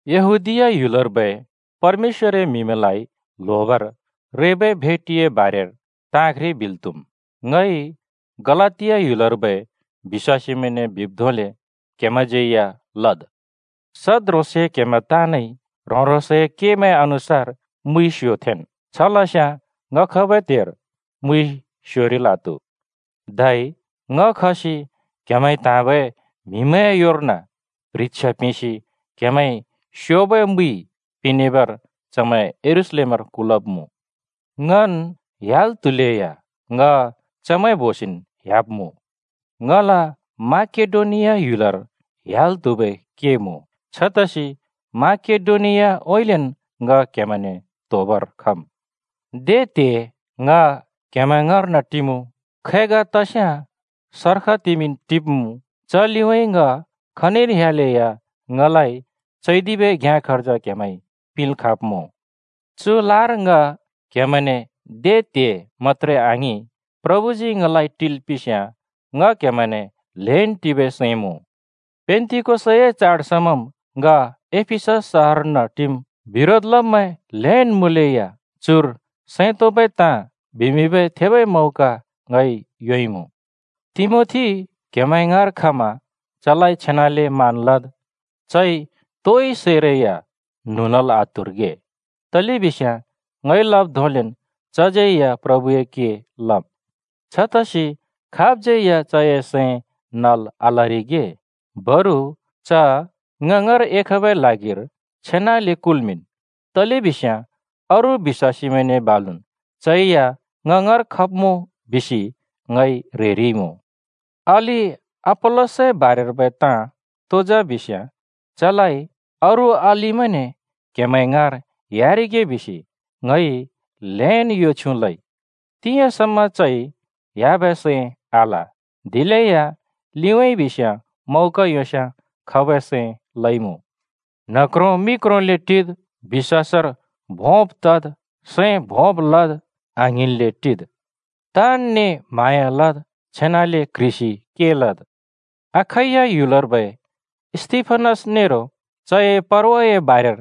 यहूदीया ह्‍युलर्बै परमेश्‍वरए म्‍हिमैंलाइ ल्होबर रेबै भेटिए बारेर ताँ घ्रि बिल् त्‍हुम्। ङइ गलातिया ह्‍युलर्बै बिश्‍वासीमैंने बिब् धोंले क्‍हेमैंज्‍यै या लद्। सद् ह्रोंसे क्हेमैं ताँनइ ह्रों‍-ह्रोंसए कमैं अनुसार मुइ स्यो थेंन्। छ लस्याँ ङ खबै त्हेर मुइ स्योरिल् आत्‍हु। धै ङ खसि क्‍हेमैंइ त्‍हाँबै म्हिमैंए योर्न प्ह्रिछ्या पिंसि क्हेमैंइ स्योबै मुइ पिंनेबर चमैं यरूशलेमर कुल्‍मिंब्‍मुँ। ङन् ह्‍याल् त्हुलेया ङ चमैं बोसिन् ह्‍याब्मुँ। ङला माकेडोनिया ह्‍युलर ह्‍याल् त्हुबै के मुँ। छतसि माकेडोनियाउँइँलेन् ङ क्‍हेमैंने त्होबर खम्। दे त्हे ङ क्‍हेमैं ङाँर्न टिमुँ, खै ग तस्याँ सर्ख तिमिंन् टिब्मुँ। च लिउँइँ ङ खनिर ह्‍यालेया ङलाइ चैदिबै घ्याँ खर्ज क्‍हेमैंइ पिंल् खाँब्मुँ। चु लार ङ क्‍हेमैंने दे त्हे मत्‍त्रे आङिं, प्रभुजी ङलाइ टिल् पिंस्‍याँ ङ क्‍हेमैंने ल्‍हेन् टिबै सैं मुँ। पेन्‍तिकोसए चाड समाम् ङ एफिसस सहरर्न टिम्। बिरोध लब्मैं ल्‍हेन् मुँलेया चुर सैं तोंबै ताँ बिमिंबै थेबै मौका ङइ योंइमुँ। तिमोथी क्‍हेमैं ङाँर खमा चलाइ छेनाले मान लद्। चइ तोइ सैरै न्हुँ लल् आत्हुरिगे, तलेबिस्याँ ङइ लब् धोंलेन् चज्‍यै या प्रभुए के लम्। छतसि खाबज्‍यै या चए सैं नल् आलरिगे, बरु च ङ ङाँर एखबै ल्हागिर छेनाले कुल्मिंन्। तलेबिस्याँ अरू बिश्‍वासमैंने बालुन् चै या ङ ङाँर खब्मुँ बिसि ङइ ह्रेरिइमुँ। अलि अपोल्‍लसए बारेर्बै ताँ तो जा बिस्याँ, चलाइ अरू अलिमैंने क्‍हेमैं ङाँर ह्‍यारिगे बिसि ङइ ल्‍हेन् यो छ्युँ लइ। तिंयाँ समा चइ ह्‍याबै सैं आल, दिलेया लिउँइँ बिस्याँ मौका योंस्‍याँ खबै सैं लइमुँ। न्ह क्रों मि क्रोंले टिद्, बिश्‍वासर भों तद्, सैं भोंब् लद्, आङ्हिंन्ले टिद्। ताँनने म्हाँया लद्। छेनाले क्ह्रिसि के लद्। अखैया ह्‍युलर्बै स्‍तिफनस नेरो चए परवाए बारेर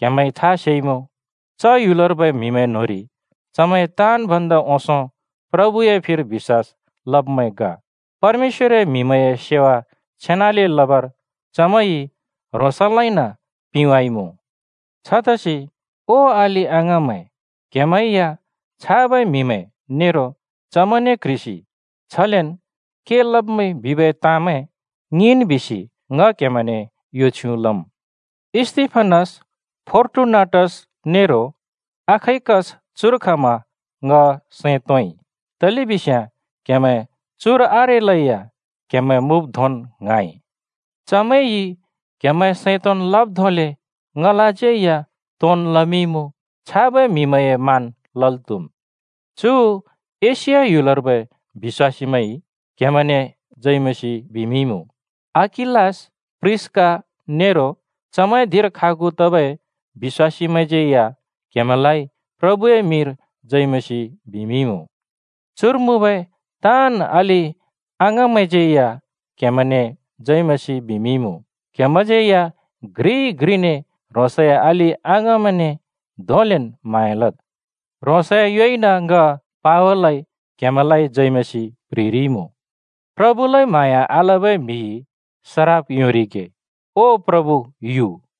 क्‍हेमैंइ था सेइमुँ। च ह्‍युलर्बै म्हिमैं न्होंरि चमैं ताँन् भन्दा ओंसों प्रभुए फिर बिश्‍वास लब्मैं ग। परमेश्‍वरए म्‍हिमैंए सेवा छेनाले लबर चमैंइ ह्रोंसलाइन पिंवाइमुँ। छतसि ओ अलि-अङाँमैं, क्‍हेमैं या छाबै म्‍हिमैं नेरो चमैंने क्ह्रिसि छलेन् के लब्‍मैंइ बिबै ताँमैं ङिंन् बिसि ङ क्‍हेमैंने यो छ्युँ लम्। स्‍तिफनस, फोर्टुनाटस नेरो अखाइकस चुर खमा ङ सैं तोंइ। तलेबिस्याँ क्‍हेमैं चुर आरेलेया क्‍हेमैं मुँब् धोंन् ङ्हाँइ। चमैंइ क्हेमैंए सैं तोंन् लब् धोंले ङलाज्यै या तोंन् लमिंइमुँ। छाबै म्‍हिमैंए मान लल् त्हुम्। चु एशिया ह्‍युलर्बै बिश्‍वासीमैंइ क्‍हेमैंने जय मसीह बिमिंइमुँ। अकिलास, प्रिस्‍का नेरो चमैंए धिंर खागु तबै बिश्‍वासीमैंज्यै या क्‍हेमैंलाइ प्रभुए मिंरि जय मसीह बिमिंइमुँ। चुर मुँबै ताँन् अलि-अङमैंज्यै या क्‍हेमैंने जय मसीह बिमिंइमुँ। क्‍हेमैंज्यै या घ्रिइ घ्रिने ह्रोंसए अलि-अङमैंने धोंलेन् म्हाँया लद्। ह्रोंसए योइन ङ पावलइ क्हेमैंलाइ जय मसीह प्ह्रिरिइमुँ। प्रभुलाइ म्हाँया आलबै म्हिइ सराप योंरिगे। ओ प्रभु यु।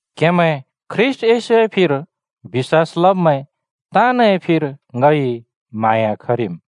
क्हेमैं ख्रीष्‍ट येशूए फिर बिश्‍वास लब्मैं ताँनए फिर ङइ म्हाँया खरिम्।